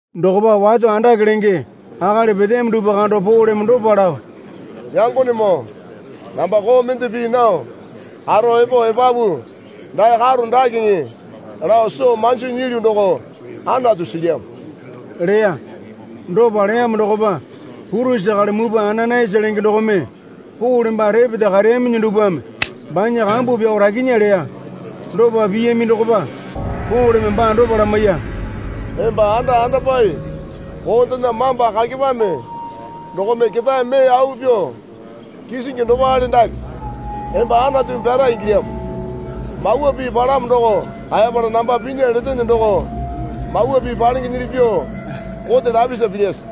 Dokopa wato andake lenge akali peteyami dupwa kando Poleme dopa lao, Yangonemoo, namba koo mende pii nao karo epo epapu dae karo dakeŋe lao soo manji nyilyu doko Anatu silyamo leya. Dopa leyamo dokopa purisi akali mupwa Ananayasa lenge dokome Pole baa repeta kareyaminyi dupwame banya kambu pyao rakinya leya. Dopa piyami dokopa Poleme baa dopa lamaiya. Emba anda andopai koondena mamba kakepame dokome ketae mee au pyuo kisingi dopale dake emba Anatumi pyara ingilyamo. Mawa Pii palamo doko kaepala namba pinya letene doko Mawa Pii palengenyili pyuo kote lapisa pilyase?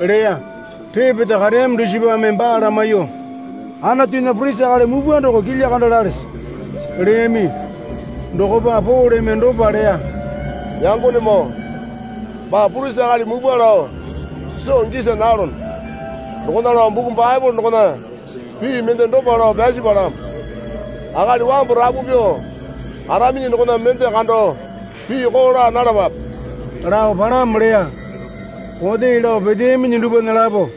leya. Repeta kareyami dusipame baa lamaiyuo, Anatunya purisi akali mupwa doko kilya kando lalese? leyami. Dokopa Poleme dopa leya. Yangonemoo, baa purisi akali mupwa lao soo gisa nalono. Dokona lao buku Baepole dokona pii mende dopa lao pyasi palamo. Akali wambu rapu pyuo karaminyi dokona mende kando pii koo laa nalapape, lao palamo leya. Kote lao peteyaminyi dupwana lapo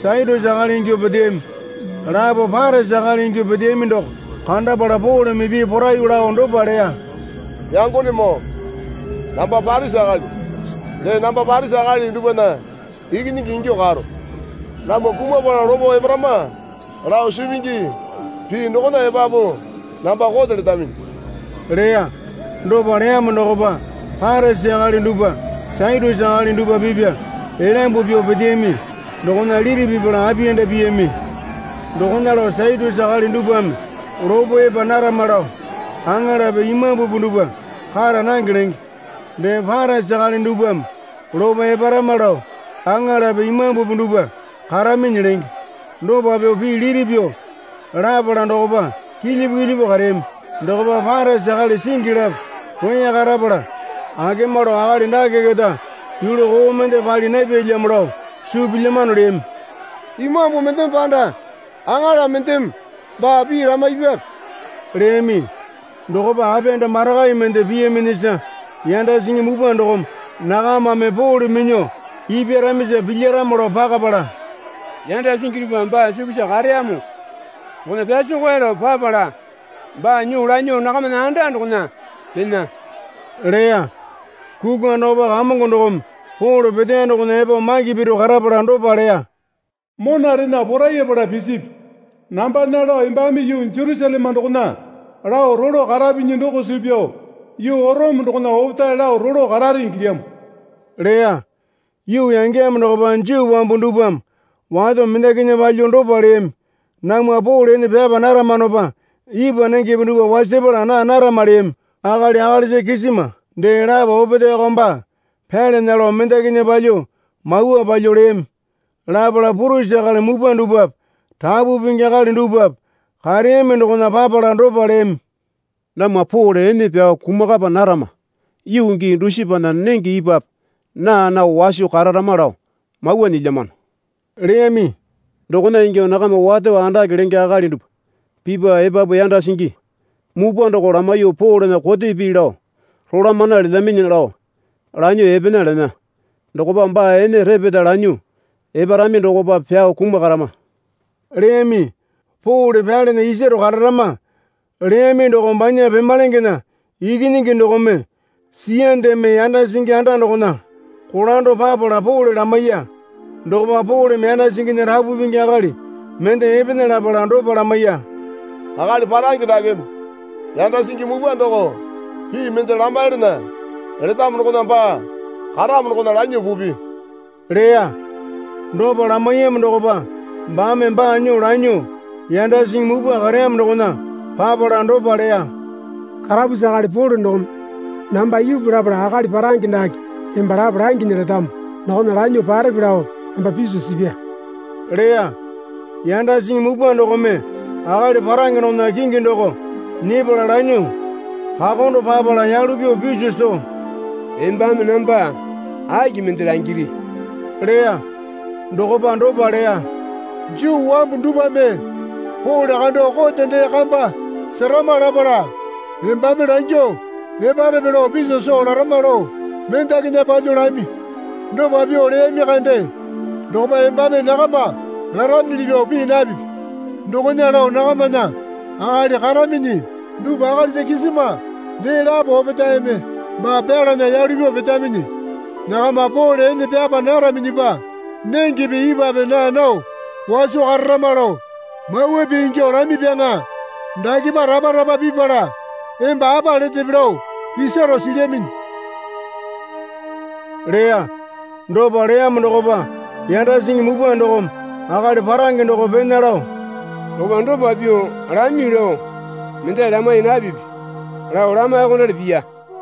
Satyusi akali ingyuo peteyami, lapo Parisi akali ingyuo peteyami doko kandapala Poleme pii poraiyuo lao dopa leya. Yangonemoo, namba Parisi akali, dee namba Parisi akali dupwana ikinyingi ingyuo karo. Namwa kumapala lopo eparama lao suu pingi pii dokona epapu namba kote letaminyi leya. Dopa leyamo dokopa Parisi akali dupwa Satyusi akali dupwa pipya elyambu pyuo peteyami dokona liti pipala apiyanda piyami. (Dokona lao Satyusi akali dupwame lopo epa narama lao aŋalape imambupi dupwa kara nange lenge. Dee Parisi akali dupwame lopo eparama lao aŋalape imambupi dupwa karaminyi lenge.) Dopa pyuo pii liti pyuo lapala dokopa kilyipu kilyipu kareyami. Dokopa Parisi akali singi lapo roya karapala akema lao akali dake keta yulu koo mende pali napyalyamo lao suu pilyamano leyami. Imambu mendeme panda aŋala mendeme baa pii lamaipyape? leyami. Dokopa apiyanda marakai mende piyaminyisa yanda singi mupwa dokome nakamame Pole minyuo ipyaramisa pilyaramo lao pakapala, yanda singi dupwa baa sukusa kareyamo dokona pyasekoe lao papala baa nyuo lanyuo nakamana anda dokona pena leya. Kukwa dokopa Kamongo dokome Pole peteya dokona epo maki piro karapala dopa leya. Monarena porayapala pisipi. Nambana lao embame yuu Jerusaleme dokona lao rolo karapinyi doko suu pyao yuu Orome dokona opetae lao rolo karare ingilyamo leya. Yuu yangeyamo dokopa Juu wambu dupwame wato mendakinya palyuo dopa leyami. Namwa Pole ene pyapa naramanopa ipwa nengepe dupwa wasapala naa narama leyami. Akali akalisa kisima dee lapo opetaeko baa pyalana lao mendakinya palyuo mawa palyuo leyami. Lapala purisi akali mupwa dupwape rapu pingi akali dupwape kareyami dokona papala dopa leyami. Namwa Pole ene pyao kumakapa narama yuu gii dusipana nenge ipwape naa nao waso kararama lao mawa nyilyamano leyami. Dokona ingyuo nakama wato andake lenge akali dupwa pipya epapu yanda singi mupwa doko lamaiyuo Polena kote pii lao rolamana letaminyi lao lanyuo epena lena. Dokopa baa ene repeta lanyuo eparami dokopa pyao kumakarama leyami. Pole pyalana isaro kararama leyami doko banya pemalengena ikinyingi dokome siyandeme yanda singi anda dokona kolando papala Pole lamaiya. Dokopa Poleme yanda singinya rapu pingi akali mende epena lapala dopa lamaiya. Akali parange dakeme yanda singi mupwa doko pii mende lamaiyalana letamo dokona baa karamo dokona lanyuo pupi leya. Dopa lamaiyamo dokopa baame baa nyuo lanyuo yanda singi mupwa kareyamo dokona papala dopa leya. Karapusi akali Pole dokome namba ipu lapala akali parange dake emba lapo langinya letamo dokona lanyuo parepe lao namba piso sipya leya. Yanda singi mupwa dokome akali parange dokona kingi doko nyepala lanyuo kakondo papala yalu pyuo piso soo, Embame namba aki mende langiri? leya. Dokopa dopa leya. Juu wambu dupwame Pole kando kote dee kamba serama lapala embame langyuo eparepe lao piso soo larama lao mendakinya palyuo lami. Dopa pyuo leyami kande dokopa embame nakama laraminyili pyuo pii napipi. Dokona lao nakamana akali karaminyi dupwa akalisa kisima dee lapo opetaeme baa pyalana yalu pyuo petaminyi. Nakama Pole ene pyapa naraminyipa nengepe ipwape naa nao waso kararama lao mawa pii ingyuo lamipyaŋa. Dakepa rapa rapa pipala emba apa letepe lao isaro silyaminyi leya. Dopa leyamo dokopa yanda singi mupwa dokome akali parange doko pena lao dokopa dopa pyuo lami lao mendali lamaiya napipi lao lamaiyuokondali piya.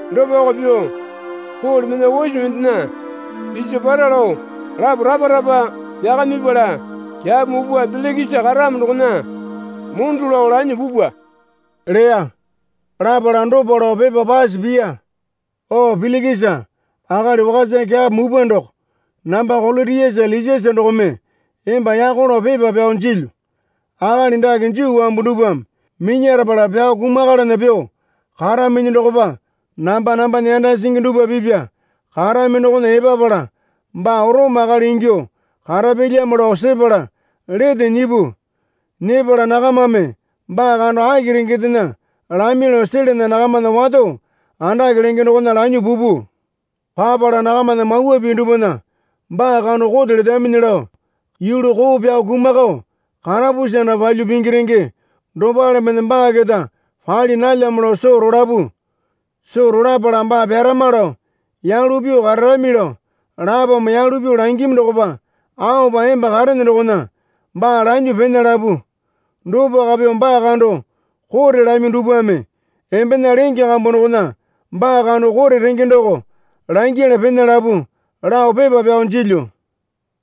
Dopako pyuo Pole mena ose mendena piso para lao lapo rapa rapa pyakamipala kyapo mupwa Pilikisa karamo dokona mondo lao lanyuo pupwa leya. Lapala dopa lao pepa pase piya. O Pilikisa akali wakasa kyapo mupwa doko namba Kolotiasa Lisiasa dokome emba yako lao pepa pyao jilyu. Akali dake Juu wambu dupwame minyarapala pyao kumakalana pyuo karaminyi dokopa namba nambana yanda singi dupwa pipya karami dokona epapala baa Orome akali ingyuo karapyalyamo lao sepala lete nyipu. Nyepala nakamame baa kando aki rengendena lami lao selana nakamana wato andake lenge dokona lanyuo pupu. Papala nakamana mawa pii dupwana baa kando kote letaminyi lao yulu koo pyao kumakao karapusi anda palyuo pingi renge dopale mende baa keta pali nalyamo lao soo rolapu. Soo rolapala baa pyarama lao yalu pyuo kararami lao lapome yalu pyuo langimi dokopa aopa emba karene dokona baa lanyuo pena lapu. Dopako pyuo baa kando kote lami dupwame embena lenge kambu dokona baa kando kote renge doko langyala pena lapu, lao pepa pyao jilyu.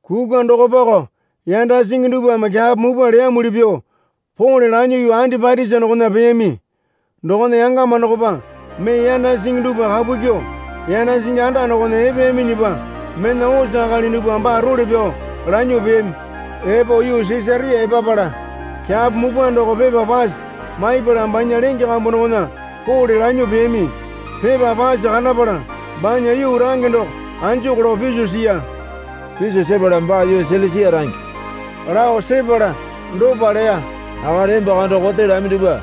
Kukwa dokopako yanda singi dupwame kyapo mupwa leyamuli pyuo Pole lanyuo yuu Andipatisa dokona peyami. Dokona yangama dokopa mee yanda singi dupwa kapu kyuo yanda singi anda dokona epeyaminyipa mena ose akali dupwa baa role pyao lanyuo peyami. Epo yuu Sisaria epapala kyapo mupwa doko pepa pase maipala banya lenge kambu dokona Pole lanyuo peyami. Pepa pase kandapala banya yuu range doko anjuku lao piso siya. Piso sepala baa yuu Silisia range lao sepala dopa leya. Akali emba kando kote lami dupwa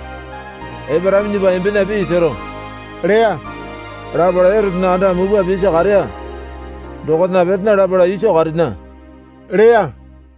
eparaminyipa embena pii sero leya. Lapala Erotena anda mupwa pisi kareya dokona petena lapala iso karena leya.